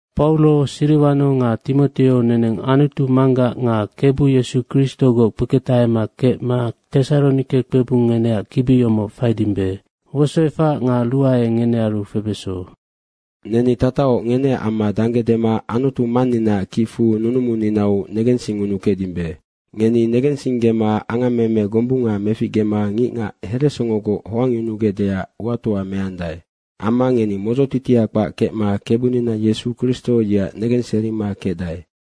Pauro, Siriwano nga Timoteo, neneng Anutu Manggac nga Kebu Yesu Kristogoc kpeketahema kecma Tesaronike kpebung ngeneac kibi yomoc faidimbe. Wosoefac nga ruae ngenearu febeso. Neni tatahoc ngeneac amma dangge dema Anutu Manninaac kicfu nunumuninau negensingunukecdimbe. Ngeni negensinggema angammeme gombunga meficgema ngicngac heresongogoc hoangyunugecdeac uatoa meandae. Amma ngeni modzotitia kpac kecma Kebunina Yesu Kristo, yeac negenserima kecdae.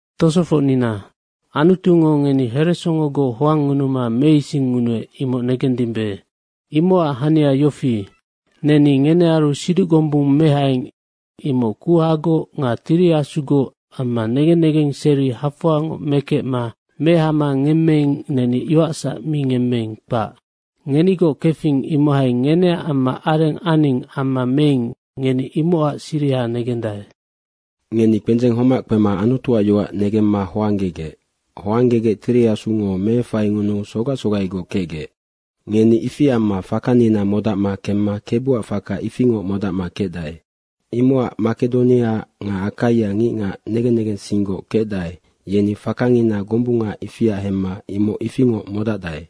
Tosofocnina, Anutungo ngeni heresongogoc hoangngunuma meisingngunuec, imoc negendimbe. Imocac hania yofi, neni ngenearu siduc gombung mehaing, imoc kuhagoc nga Tiri Asugoc amma negen negenseri hafoangoc mekecma mehama ngemmeing, neni yoacsac mi ngemmeing, kpac. Ngenigoc kefing, imohai ngeneac amma areng aning amma meing, ngeni imocac siriha negendae. Ngeni kpendzeng homac kpema Anutuac yoac negemma hoanggegec. Hoanggegec Tiri Asungo meefaingunuu sogac sogaigoc kecgec. Ngeni ifi amma fakanina modacma kemma Kebuac faka ifingoc modacma kecdae. Imocac Makedonia nga Akaia ngicngac negen negensinggoc kecdae, yeni fakangina gombunga ifia hemma imoc ifingoc modacdae.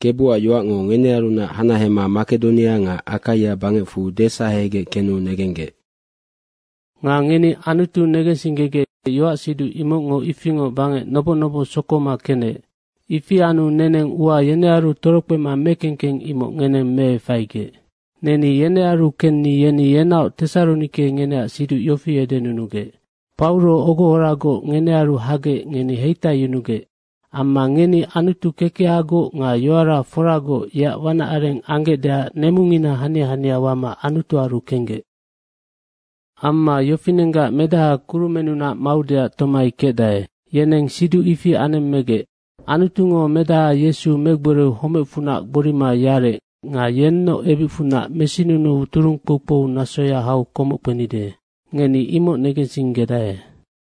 Kebuac yoacngo ngenearunac hanahema Makedonia nga Akaia bangecfu desahegec kenu negenggec. Nga ngeni Anutu negensinggegec, yoacsiduc imocngo ifingoc bangec noboc noboc sokoma kenec. Ifi anu neneng ua yenearu torokpema mekengkeng imoc ngeneng meefaigec. Neni yenearu kenni yeni yenaoc Tesaronike ngeneac siduc yofi edenunugec, “Pauro ogohoragoc ngenearu hagec ngeni heitaiyunugec. Amma ngeni Anutu kekehagoc nga yoara foragoc yeac wanac areng anggecdeac nemungina hania hania wama Anutuaru kenggec. Amma yofinenggac Medaha kurumennunac maudeac tomai kecdae.” yeneng siduc ifi anemmegec. Anutungo Medaha Yesu megboriu homecfunac gborima yarec nga yennoc ebicfunac mesinunuu turung kpoukpou nasoya hau komoc kpenide. Ngeni imoc negensinggedae.